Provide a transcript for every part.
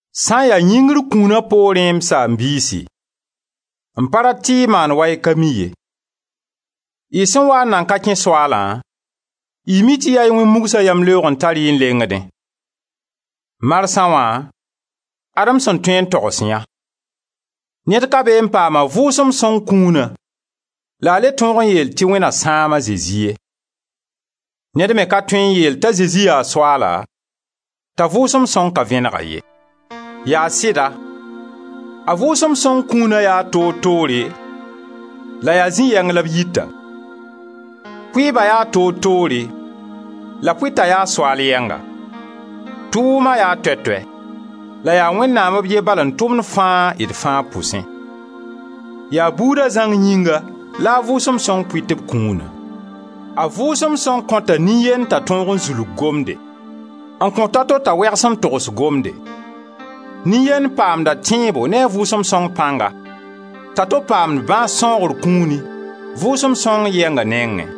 Sã n ya yĩngr kũna poorẽ, m saam-biisi, m pa rat tɩ y maan wa y ka mi ye. Y sẽn waa n nan ka kẽ Soaalã, y mi tɩ yaa y wẽn-mugsã yamleoog n da tar-y n lengdẽ. Marsa wã ad-m sẽn tõe n togs yã: Ned ka bee n paam a Vʋʋsem Sõng kũuna la a le tõog n yeel tɩ «Wẽn na sãam a Zezi ye.» Ned me ka tõe n yeel t'a «Zezi la Soaala» t'a Vʋʋsem Sõng ka vẽneg-a ye. Yaa sɩda, a Vʋʋsem Sõng kũuna yaa toor-toore la yaa zĩ-yɛng la b yita. Pʋɩɩba yaa toor-toore la Pʋɩta ya Soaal yɛnga, tʋʋma yaa toɛ-toɛ la yaa Wẽnnaam b ye bal n tʋmd fãa d fãa pʋsẽ. Yaa buuda zãng yĩnga la a Vʋʋsem Sõng pʋɩt b kũuna. A Vʋʋsem Sõng kõta nin-yend t'a tõog n zulg gomde; n kõt a to t'a wegs n togs gomde; nin-yend paamda tẽebo ne a Vʋʋsem Sõng pãnga, t'a to paamd bãas sãoogr kũuni Vʋʋsem Sõng yɛnga nengẽ.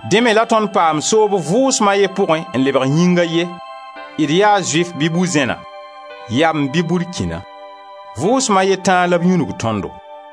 Dẽ me la tõnd paam soob Vʋʋsma a ye pʋgẽ n lebg yĩng a ye, d ya Zʋɩf bɩ bu-zẽna, yamb bɩ burkĩna; Vʋʋsma a ye tãa la b yũnug tõndo.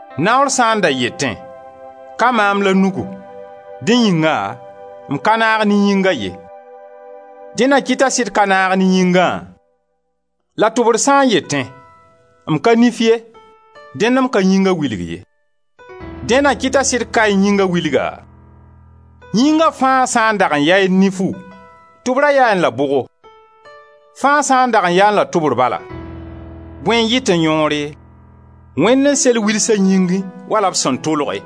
Naoor sã n da yetẽ: «Ka maam la nugu; dẽ yĩnga m ka naag ne yĩnga ye,» dẽ na kɩt t'a sɩd ka naag ne yĩngã? La tʋbr sã n yetẽ: «M ka nif ye; dẽnd m ka yĩnga wilg ye,» dẽ na kɩt t'a sɩd kaẽ yĩnga wilga? Yĩnga fãa sã n dag n yaẽ nifu, tʋbra yaẽ la bʋgo? Fãa sã n dag n yaẽ la tʋbr bala, bõe n yɩtẽ yõore? Wẽnd n sel wilsã yĩngẽ, wala b sẽn tʋlge.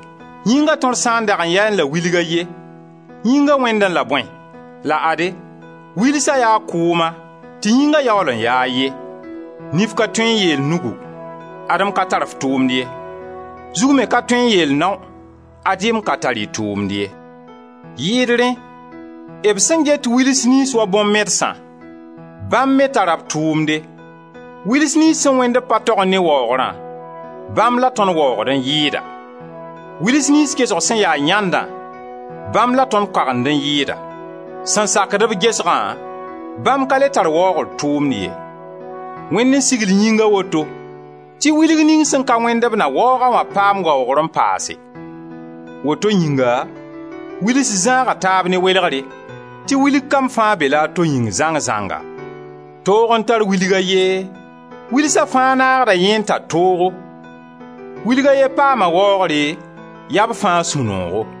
Yĩnga tõr sã n dag n yaẽ la wilg a ye, yĩnga wẽndẽ la bõe? La ade, wilsa yaa kʋʋma, tɩ yĩnga yaool n yaa a ye. Nif ka tõe n yeel nugu: «Ad-m ka tar f tʋʋmd ye.» Zug me ka tõe n yeel nao: «Ad-y m ka tar y tʋʋmd ye.» Yɩɩd rẽ, b sẽn get wils niyns wa bõn-mɛdsã, bãmb me tara b tʋʋmde, Wils niyns sẽn wẽnd-b pa togẽ ne waoogrã, bãmb la tõnd waoogd n yɩɩda; wils niyns gesg sẽn ya yãndã, bãmb la tõnd koagend n yɩɩda. Sẽn sakd-b gesgã, bãmb ka le tar waoogr tʋʋmd ye. Wẽnd n sigl yĩnga woto, tɩ wilg ning sẽn ka wẽnd b na waoog-a wã paamd waoogr n paase. Woto yĩnga wils zãaga taab ne welegre, tɩ wilg kam fãa be-la a to yĩng zãng-zãnga. Toog n tar wilg a ye, wilsa fãa naagda yẽ n tar toogo; wilg a ye paama waoogre, yaa b fãa sũ-noogo.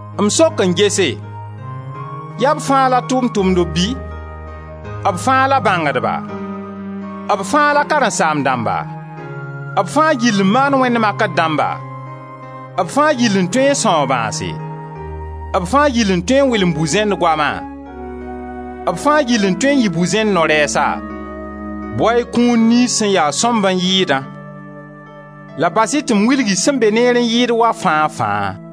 M sok n gese, yaa b fãa la tʋʋm-tʋmdb bɩ? B fãa la bãngdba? B fãa la karen-saam-dãmba? B fãa gill n maand wẽnd makr dãmba? B fãa gill n tõe n sãoog bãase? B fãa gill n tõe n wɩlem bu-zẽnd goama? B fãa gill n tõe n yɩ bu-zẽnd no-rɛɛsa? Bao-y kũun niyns sẽn ya-b sõmb n yɩɩdã. La bas-y tɩ m wilg-y sẽn be neer n yɩɩd wa fãa-fãa.